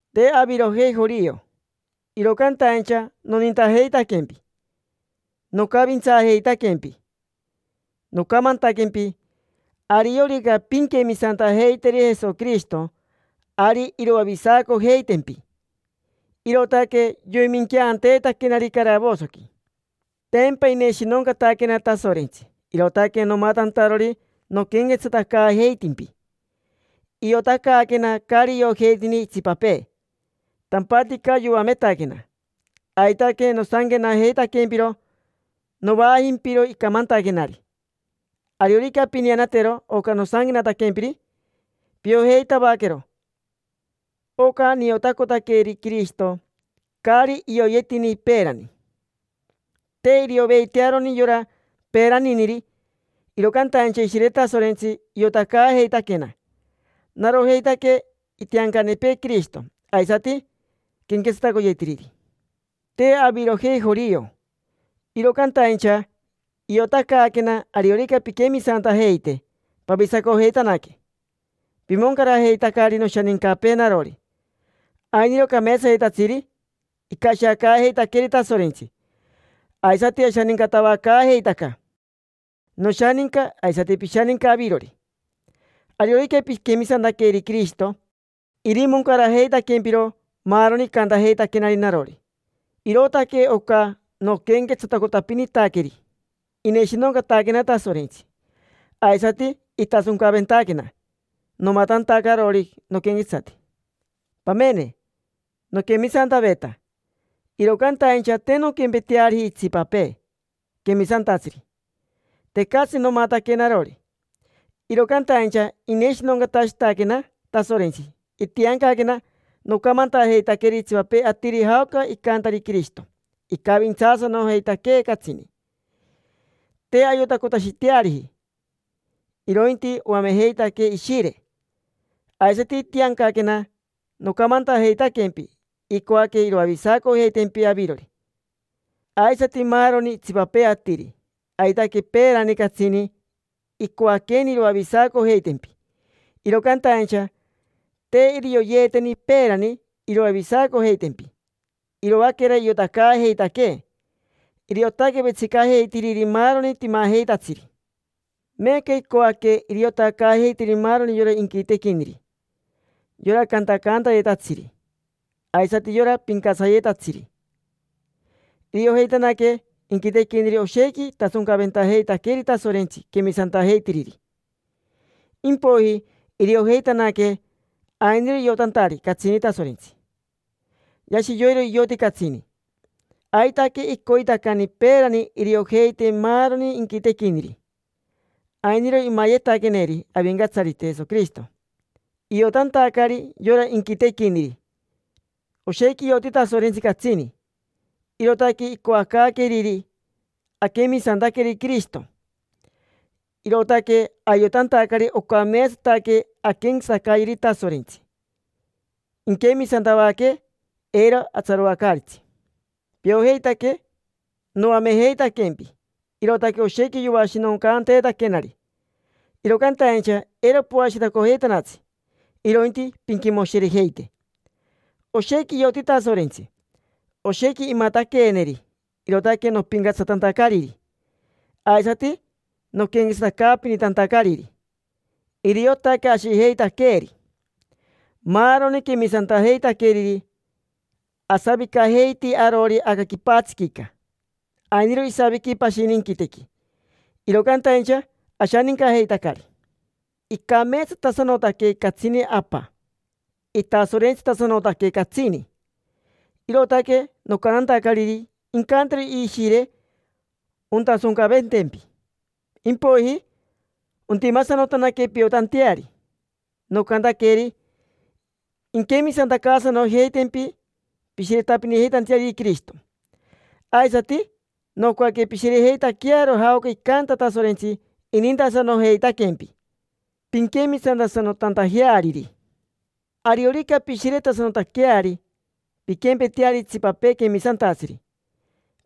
Te avirojei jorio, iro cantaincha nonintajeitaquempi. Nocavintsaajeitaquempi, nocamantaquempi: “Ariorica pinquemisantajeiteri Jesoquirishito, ari iroavisacojeitempi”, irootaque yoiminqueanteetaquenari caravosoqui. Tempa ineshinoncataquena Tasorentsi, irootaque nomatantarori noquenquetsatacaajeitimpi. Iotacaaquena caari iojeitini itsipapee, tampatica yoametaquena. Aitaque nosanquenajeitaquempiro, novaajimpiro icamantaquenari. Ariorica pineanatero oca nosanquenataquempiri, piojeitavaquero oca niotacotaqueri Quirishito, caari ioyeetini peerani. Te irioveitearoni yora peeraniniri, iro cantaincha Ishire Tasorentsi iotacaajeitaquena: narojeitaque itiancanepee Quirishito aisati quenquetsatacoyetiriri. Te avirojei jorio, iro cantaincha iotacaaquena ariorica pinquemisantajeite, pavisacojeitanaque. Pimoncarajeitacari noshanincapee narori: ainiro cameetsayetatsiri icashiacaajeitaqueeri Tasorentsi. Aisati ashanincatavacaajeitaca: noshaninca aisati pishaninca avirori. Ariorica piquemisantaqueri Quirishito, irimoncarajeitaquempiro maaroni icantajeitaquenari narori. Irootaque oca noquenquetsatacotapinitaqueri. Ineshinoncataquena Tasorentsi, aisati itasoncaventaquena, nomatantacarori noquenquetsati. Pamene, noquemisantaveta; iro cantaincha te nonquempeteariji itsipapee quemisantatsiri: tecatsi nomataque narori. Iro cantaincha ineshinoncatashitaquena Tasorentsi, itiancaquena nocamantajeitaqueri itsipapee atiri jaoca icantari Quirishito icavintsaasanojeitaquee catsini. Te ayotacotashiteariji, irointi oamejeitaquee Ishire. Aisati itiancaquena nocamantajeitaquempi icoaque iroavisacojeitempi avirori, aisati maaroni itsipapee atiri. Aitaque peerani catsini icoaqueni iroavisacojeitempi, iro cantaincha te irioyeeteni peerani iroavisacojeitempi, iroaquera iotacaajeitaquee. Iriotaque vetsicajeitiriri maaroni timajeitatsiri. Meeca icoaque iriotacaajeiteri maaroni yora inquitequiniri: yora cantacaantayetatsiri aisati yora pincatsariyetatsiri. Iriojeitanaque inquitequiniri oshequi itasoncaventajeitaqueri Tasorentsi quemisantajeitiriri, impoiji iriojeitanaque ainiro iotantari catsini Tasorentsi, yashi yoiro ioti catsini. Aitaque icoitacani peerani iriojeite maaroni inquitequiniri. Ainiro imayetaqueeneri Avincatsarite Jesoquirishito, iotantacari yora inquitequiniri oshequi ioti Tasorentsi catsini. Irootaque icoacaaqueriri. Aquemisantaqueri Quirishito, irootaque ayotantacari ocameetsataque anquenquetsatacayeri Tasorentsi, inquemisantavaquee. Eiro atsaroacaaritsi. Piojeitaque noamejeitaquempi, irootaque oshequi yoashinoncanteetaquenari, iro cantaincha eiro poashiretacojeitanatsi, irointi pinquimoshirejeite. Oshequi ioti Tasorentsi, oshequi imataqueeneri, irootaque nopincatsatantacariri, aisati noquenquetsatacaapinitantacariri. Iriotaque ashijeitaqueeri, maaroni quemisantajeitaqueriri. Asavicajeiti arori aca quipatsiquica, ainiro isaviqui pashini inquitequi, iro cantaincha ashanincajeitacari. Icameetsatasanotaque catsini Apa, itasorentsitasanotaque catsini, irootaque nocantantacariri incantero Ishire ontasoncaventempi, impoiji ontimasanotanaque piotanteari. Nocantaqueri inquemisantacaasanojeitempi, pishiretapinitanteariri Quirishito. Aisati, nocoaque pishirejeitaquearo jaoca icanta Tasorentsi inintasanojeitaquempi, pinquemisantasanotantajeariri. Ariorica pishiretasanotaqueari, pinquempeteari itsipapee quemisantatsiri,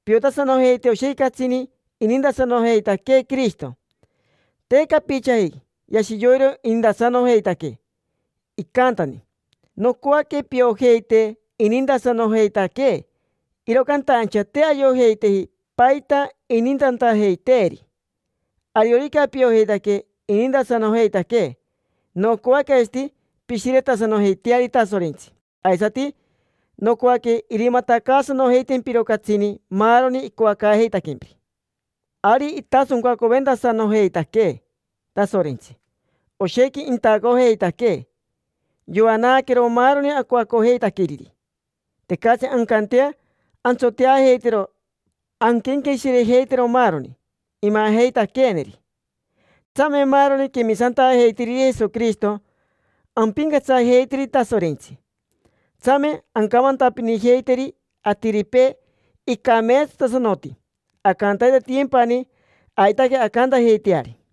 piotasanojeite oshequi catsini inintasanojeitaquee Quirishito, te capichaji. Yashi yoiro inintasanojeitaquee, icantani. Nocoaque piojeite inintasanojeitaquee, iro cantaincha te ayojeiteji paita inintantajeiteeri. Ariorica piojeitaque inintasanojeitaquee, nocoaque aisati pishiretasanojeiteari Tasorentsi aisati nocoaque irimatacaasanojeitempiro catsini maaroni icoacaajeitaquempiri. Ari itasoncaventasanojeitaquee Tasorentsi, oshequi intacojeitaquee, yoanaaqueero maaroni acoacojeitaqueriri. Tecatsi ancantea antsoteajeitero anquenqueshirejeitero maaroni imajeitaqueeneri. Tsame maaroni quemisantajeitiriri Jesoquirishito ampincatsajeiteri Tasorentsi; tsame ancamantapinijeiteri atiripee icameetsatasanoti, ancantaitatiyempani. Aitaque ancantajeiteari.